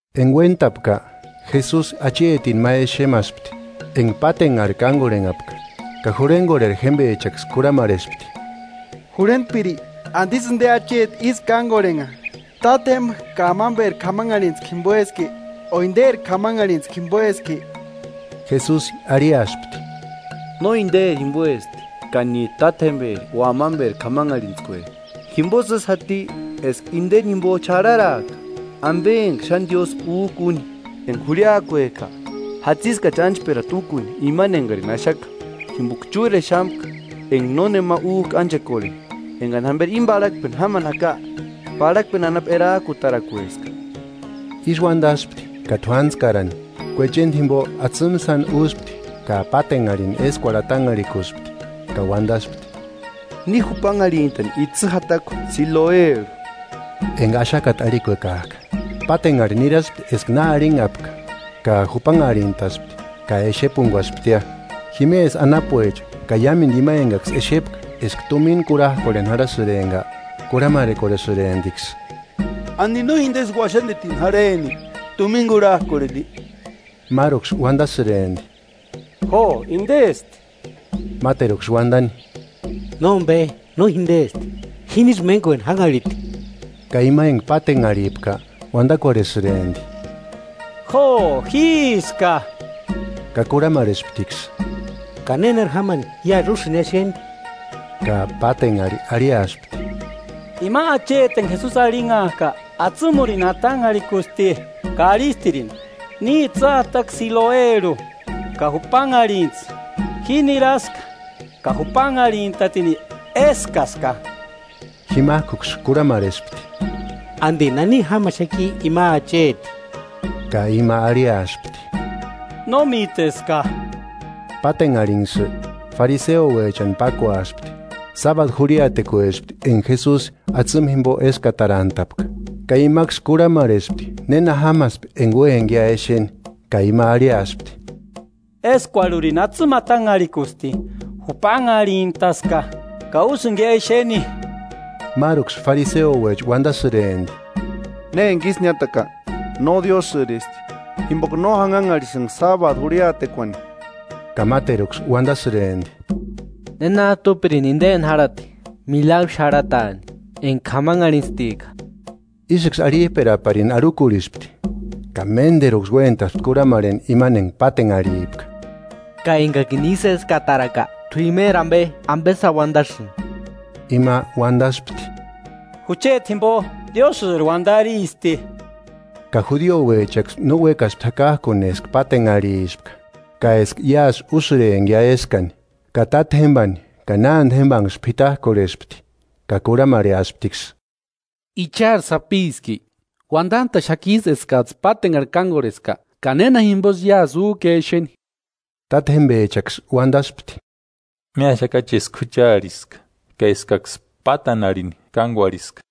Enga uéntapka, Jesusi achetini ma exemaspti enga pátenharhi kángorhenhapka. Ka jurhengorheri jémbechaksï kurhamarhespti: –Jurhentpiri, ¿Andisï inde acheti ísï kángorhenha? ¿Tátjemba ka amamberi k'amanharhitskua jimboeski o inderi k'amanharhitskua jimboeski? Jesusi arhiaspti: –No inderi jimboesti, ka níjtu tátjemberi o amamberi k'amanharhintskue, jimbosï ísï jati eska indeni jimbo xarharaaka ambe enga xáni Diósï újka uni. Enga jurhiakuejka, jatsiskachi ánchperata úkuni imani engarini axaka; jimboka chúrexamka enga nónema újka ánchekorheni. Engani jámberi íni parhakpeni jámani jaka, parhakpeni anapu erajkutarakueska. Ísï uandaspti ka t'uantskarani, kuechenda jimbo atsïmu sáni úspti ka pátenharhini éskuarhu atanharhikuspti. Ka uandaspti: –Ni jupanharhintani itsï jatakua Siloerhu (enga “Axakata” arhikuekajka), Pátenharhi niraspti eska na arhinhapka ka jupanharhintaspti ka exepunguasptia. Jimesï anapuecha ka iámendu ima engaksï exepka eska tumina kurhajkorheni jarhasïrempka, kurhamarhekorhesïremptiksï: –¿Andi no indesï uaxandetini jarheni tumina kurhajkorheni? Máruksï uandasïrempti: –Jo indesti. Máteruksï uandani: Nombe, no jindesti, jinisï májkueni jánharhiti. Ka ima enga patenharhipka uandakorhesïrempti: –Jo, jíska. Ka kurhamarhesptiksï: –¿Ka nénari jámani iásï úsïngia exeni? Ka pátenharhi arhiaspti: –Ima acheti enga Jesusi arhinhajka, atsimurini atanharhikusti, ka arhistirini: Ni itsï jatakua Siloerhu ka jupanharhintsï. Ji niraska, ka jupanharhintatini, eskaska. Jimajkuksï kurhamarhespti: –¿Andi nani jámaxaki ima acheti? Ka ima arhiaspti: –No míteska. Pátenharhinksï fariseuechani pákuaspti, sábadu jurhiatekuespti enga Jesusi atsïmu jimbo eskatarantapka. Ka imaksï kurhamarhespti néna jámaspi enga úempkia exenia. Ka ima arhiaspti: –Eskuarhurini atsïmu atanharhikusti, jupanharhintaska, ka úsïngia exeni. Máruksï fariseouecha uandasïrempti: Ne emanga ísï niátaka, no Diósïristi, jimboka no janhanharhisïnga sábadu jurhiatekuani. Ka máteruksï undasïrempti: –¿Nénajtu úpirini indeni járhati milagru xarhataani enga k'amanharhintstika? Ísïksï arhijperaparini arhukurhispti, ka ménderuksï uéntaspti kurhamarheni imani enga patenharhipka: –Ka engakini ísï éskataraka, t'u imeri ambe, ¿Ambe sáni uandasïni? Ima uandaspti: –Jucheti jimbo Diósïri uandaristi. Ka judiouechaksï no uékaspti jakajkuni eska pátenharhispka ka eska iásï úsïrempkia eskani, ka tátjembani ka nánde jémbanksï p'itajkorheaspti, ka kurhamarhesptiksï: –¿I chári sapiski? ¿Uandantaxakijtsï eskajtsï pátenharhi kángorheska? Ka ¿Néna jimbosï iásï újkia exeni? Tátjemba jembechaksï undaspti: –Míaxakachi eska juchariska, ka eskaksï pátanharhini kángorheska;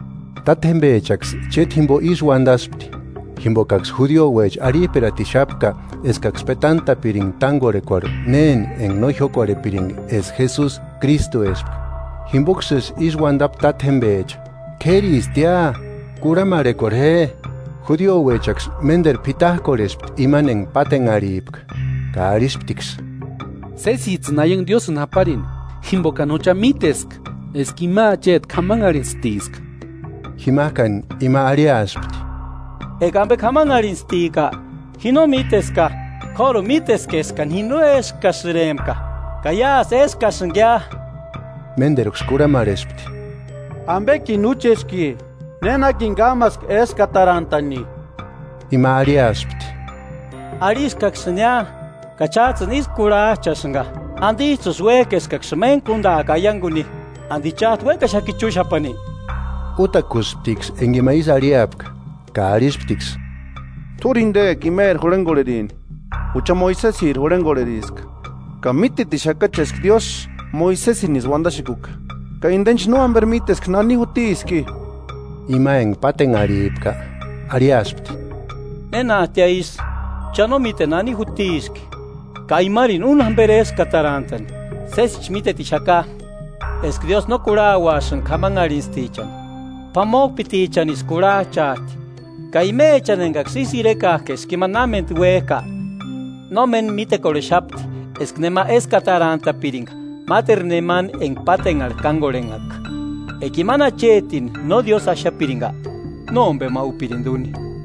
Tátjembechaksï chéta jimbo ísï uandaspti, jimbokaksï judiouecha arhijperatixapka eskaksï petantapiringa tángorhentskuarhu néni enga jiókorhepiringa eska Jesusi Krístuespka. Jimboksïsï ísï uandapti tátjembecha: “K'éristia, kurhamarhekorhe je.” Judiouechaksï ménderu p'itajkorhespti imani enga pátenharhipka, ka arhisptiksï: –Sésijtsïni aiangu Diósïni japarini. Jimbokani jucha míteska eska ima acheti k'amanharhintstiska. Jimajkani ima arhiaspti: –Enga ambe k'amanharhintstika, ji no míteska. K'óruni míteska eskani ji no éskasïrempka ka iásï éskasïngia. Ménderuksï kurhamarhespti: –¿Ambekini úcheski? ¿Nénakini kámaski éskatarantani? Ima arhiaspti: –Arhiskaksïnia, ka chájtsïni ísku kurhajchasïnga. ¿Andijtsïsï uéjki eskaksïni méntku úndaaka aianguni? ¿Andi chájtu uékaxaki chúxapani? Útakusptiksï enga ima ísï arhiapka, ka arhisptiksï: –T'úri jindeka imeri jurhengorherini; jucha Moisesiri jurhengorheriska. Ka mítetixakachi eska Diósï Moisesinisï uandaxekuka, ka indenchi no jamberi míteska nani jutiski. Ima enga pátenharhipka arhiaspti: –¡Nénajtia isï! Cha no míteni nani jutiski, ka imarini úni jámberi éskatarantani. Sésichi mítetixaka eska Diósï no kurhauasïnga k'amanharhintstichani; p'amojpitichanisï kurhajchaajti ka imechani engaksï ísï irekajka eska ima námendu uéjka. Nómeni mítekorhexapti eska nema éskatantapiringa máteru nemani enga pátenharhi kángorhenhaka. Eka imani achetini no Diósï axapiringa, nómbema úpirindi úni.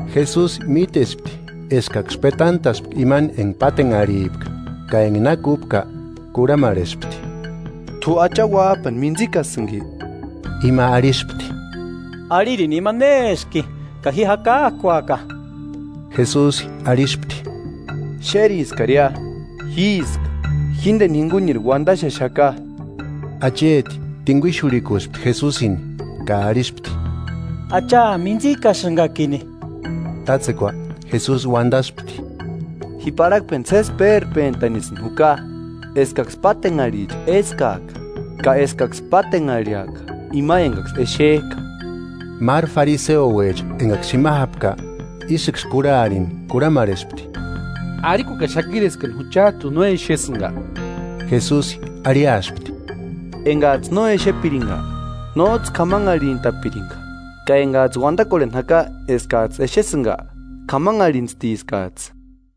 Jesusi mítespti eskaksï pátenharhini petantaspka; ka enga na kúpka kurhamarhespti: –¿T'u Acha Uájpani mintsikasïnki? Ima arhispti: –Arhirini ima néski, ka ji jakajkuaka. Jesusi arhispti: –Xériskaria: Jíska, jíndeni jinguniri uandaxexaka. Acheti tinguixurhikuspti Jesusini ka arhispti: –Acha, mintsikasïngakini. Tátsekua Jesusi uandaspti: Ji parhakpeni sési péjpentanisïni juka, eskaksï pátenharhicha éskaaka ka eskaksï pátenharhiaka ima engaksï exejka. Máru fariseouecha engaksï jima jápka, ísïksï kurharini kurhamarhespti: –¿Arhikuekaxakiri eskani juchajtuni no exesïnga? Jesusi arhiaspti: –Engajtsï no exepiringa, nójtsï k'amanharhintapiringa. Ka engajtsï uandakorheni jaka eskajtsï exesïnga, k'amanharhintstiskajtsï.